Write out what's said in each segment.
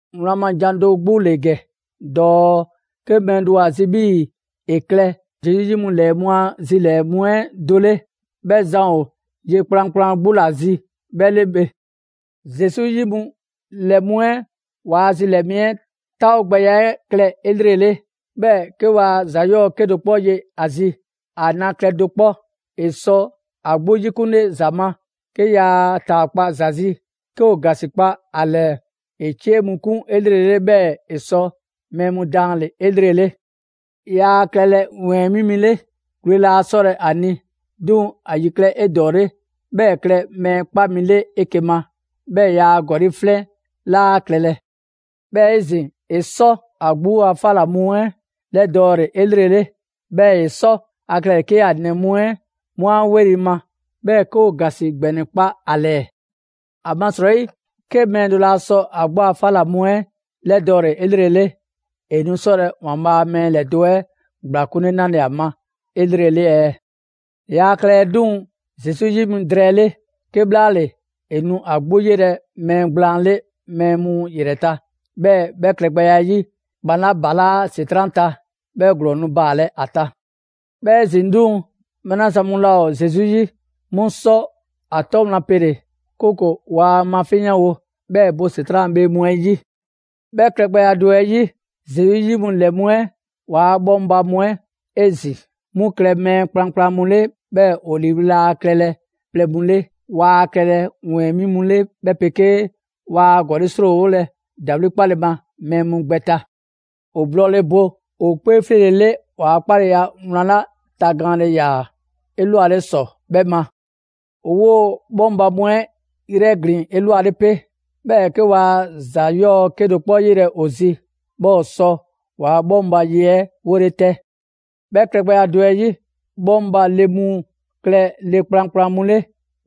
Wlan ma jan do 'gbu ‑le ‑gɛ dɔɔ: 'ke mɛɛ do ‑o ‑a zi' 'bhii‑ ‑e klɛ Zesu 'yi mu ‑lɛ mu a zilɛɛ‑ 'lɛɛ mu 'ɛ do 'le, 'bhɛ zan ‑o ye kplankplan 'gbu ‑la zi 'bhɛ 'le bhe. Zesu 'yi mu ‑lɛ mu 'ɛ ‑waa' zilɛɛ‑ mu 'ɛ 'taawogbɛya 'ɛ klɛ 'elrele, 'bhɛɛ‑ 'ke waa ‑za 'yɔɔ‑ do 'kpɔ ye ‑o zi. ‑A na klɛ do 'kpɔ, ‑e 'sɔ ‑a 'gbu 'yikunle ‑za ma, 'ke yaa ‑a ‑taakpa' ‑za zi, 'ke ‑o ‑gasikpa ‑a ‑lɛɛ, ‑e 'cie mu 'kun 'elrele, 'bhɛɛ‑ ‑e 'sɔ mɛɛ mu daanle‑ 'elrele. Yaa klɛlɛ ‑wɛɛn mi 'le, gwle laa 'sɔlɛ‑ ‑a ni. 'Duŋ‑ ‑a ‑yi klɛ 'edɔɔle, 'bhɛɛ‑ ‑e klɛ mɛɛ 'kpa mi 'le 'eke‑ ma. 'Bhɛɛ‑ yaa ‑gɔli' 'flɛn 'laa klɛlɛ. 'Bhɛɛ‑ 'ezin‑, ‑e 'sɔ ‑a 'gbu a 'fa ‑la mu 'ɛ 'lɛdɔɔle 'elrele. 'Bhɛɛ‑ ‑e 'sɔ ‑a klɛle‑ 'ke ‑a ‑nɛ mu 'ɛ 'mu 'a 'weli‑ ma, 'bhɛɛ‑ 'ke ‑o ‑gasi ‑gbɛnɛ kpa ‑a ‑lɛɛ. ‑Amasrɔyi 'ke mɛɛ do laa sɔ ‑a 'gbu a 'fa ‑la mu 'ɛ 'lɛdɔɔle 'elrele, ‑e nu 'sɔlɛ‑ ‑Waanbhaa' a mɛɛ ‑lɛdo' 'ɛ ‑gblakunle 'nale‑ ‑a ma 'elrele ɛɛ? Yaa klɛlɛ 'duŋ‑ Zesu 'yi mi drɛɛ 'le; 'kebhlaale, ‑e nu ‑a 'gbu 'yelɛ‑ mɛɛ gblaan 'le mɛɛ mu ‑yrɛ ta, 'bhɛɛ‑ 'bhɛ klɛgbɛya 'ɛ 'yi, ‑kpan 'la ‑balaa' ‑Setran' ta, 'bhɛ ‑glɔɔn nu baalɛ ‑a ta. 'Bhɛɛ‑ 'ezin‑ 'duŋ‑, mɛɛ 'la zan mu laa ‑o Zesu 'yi, 'mu 'sɔ ‑a 'tɔ wlan pele‑; 'kooko‑ waa mafinyanwo, 'bhɛɛ‑ ‑e bɔ ‑Setran' a bhee mu 'ɛ 'yi. 'Bhɛ klɛgbɛya do 'ɛ 'yi, Zesu 'yi mu ‑lɛ mu 'ɛ ‑waa' 'bhɔŋba‑ mu 'ɛ 'ezin‑, 'mu klɛ mɛɛ kplankplan mu 'le, 'bhɛɛ‑ ‑o ‑liiwli' laa klɛlɛ plɛ mu 'le; waa klɛlɛ ‑wɛɛn 'mi mu 'le 'bhɛ 'pegee waa ‑gɔli' 'srɔɔwolɛ ‑dawli' 'kpalele mɛɛ mu gbɛ ta. ‑O blɔɔle bo ‑o 'kpee 'fleele‑ 'le ‑waa' 'kpaleya wlan 'la tagaanle ‑yaa 'elwale ‑sɔ 'bhɛ ma. ‑O 'woo‑ 'bhɔŋba‑ mu 'ɛ 'yrɛglin‑ 'elwale 'pe; 'bhɛɛ‑ 'ke waa ‑za 'yɔɔ‑ do 'kpɔ 'yelɛ‑ ‑o zi, 'bhɛɛ‑ ‑o sɔ ‑waa' bhɔŋba ye 'ɛ 'wole 'tɛ. 'Bhɛ klɛgbɛya do 'ɛ 'yi, bhɔŋba le mu klɛ le kplankplan mu 'le,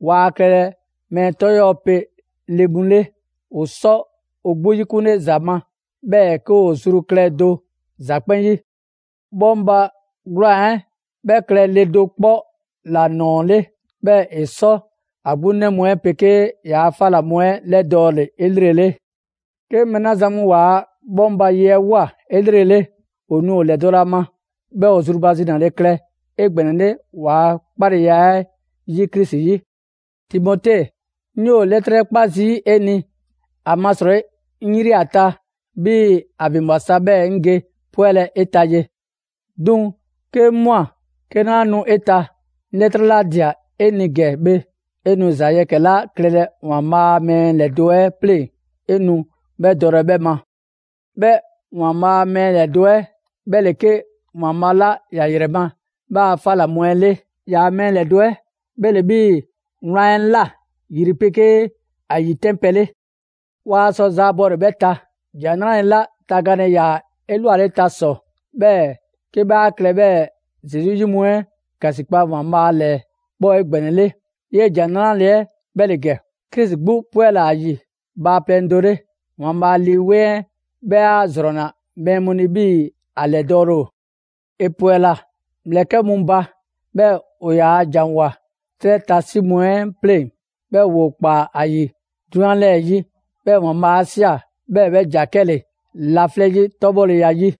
waa klɛlɛ mɛɛ 'tɔ 'yɔɔ‑ 'pe le mu 'le, ‑o 'sɔ ‑o 'gbu 'yikunle ‑za ma, 'bhɛɛ‑ 'ke ‑o zru klɛ do ‑za 'kpɛn 'yi. 'Bhɔŋba‑ 'gwlaan‑ 'ɛ, 'bhɛ klɛ le do 'kpɔ ‑la ‑nɔɔ 'le, 'bhɛɛ‑ ‑e 'sɔ ‑a 'gbu 'nɛ mu 'ɛ 'pegee ‑yaa' 'fa ꞊la mu 'ɛ 'lɛdɔɔle 'elrele. 'Ke mɛɛ 'la zan mu ‑waa' 'bhɔŋba‑ ye 'ɛ ꞊woa 'elrele, ‑o nu ‑o ‑lɛdɔlɛ ‑a ma; 'bhɛɛ‑ ‑o zrubazinale klɛ 'egbɛnɛle ‑waa' 'kpaleya 'ɛ 'yi Krisi 'yi. Timote, 'ŋ 'yoo‑ 'lɛtrɛ 'kpa zii' 'e ni, ‑amasrɔyi 'ŋ 'yri ‑a ta 'bhii‑ ‑a ‑vinbwa sa 'bhɛɛ‑ 'ŋ ge 'pwɛlɛ‑ 'e ta ye. 'Duŋ‑ 'ke 'ŋ ꞊mwa 'ke 'naa nu 'e ta, 'ŋ 'lɛtrɛ 'la ꞊dia 'e ni ‑gɛ bhe, 'e nu ‑za yɛkɛ‑ 'la klɛlɛ ‑Waanbhaa' a mɛɛ ‑lɛdo' 'ɛ 'pleŋ‑, 'e nu 'bhɛ dɔlɛ 'bhɛ ma. 'Bhɛ ‑Waanbhaa' a mɛɛ ‑lɛdo' 'ɛ 'bhɛ ‑le 'ke ‑Waanbhaa' 'la ‑ya ‑yrɛ ma 'bhɛ a 'fa ꞊la mu 'ɛ 'le. ‑Yaa' mɛɛ mu ‑lɛdo' 'ɛ 'bhɛ ‑le 'bhii‑ wlan 'ɛ ꞊la yri 'pegee ‑a ‑yitɛnpɛ 'le. Waa sɔ zaabɔle 'bhɛ ta, ‑Jan 'Nrale‑ 'la tagaanle ‑yaa 'elwaleta ‑sɔ, 'bhɛɛ‑ 'ke 'bhɛ a klɛ 'bhɛɛ‑ Zesu 'yi mu 'ɛ ‑gasikpa ‑Waanbhaa' ‑lɛɛ 'bhɛ ‑o 'egbɛnɛle. 'Yee‑ ‑Jan 'Nrale‑ 'ɛ 'bhɛ ‑le ‑gɛ: Krisi 'gbu 'pwɛla‑ ‑a ‑yi bhaaplɛŋ do 'le; ‑Waanbhaa' Lii 'Weŋ 'ɛ 'bhɛ 'a ‑zrɔnna mɛɛ mu ni 'bhii‑ ‑a ‑lɛdɔɔle ‑o. ‑E ‑pwɛla ‑mlɛkɛ' mu ba; 'bhɛɛ‑ ‑o ‑yaa ‑janwoa 'trɛ ta 'si mu 'ɛ pleŋ‑; 'bhɛɛ‑ ‑woo ‑kpaa ‑a ‑yi 'drunyan 'lɛɛ‑ 'yi; 'bhɛɛ‑ ‑Waanbhaa' 'a ꞊sia 'bhɛɛ‑ 'bhɛ ‑ja 'kɛle‑ laflɛ' 'yi 'tɔbhɔleya 'yi.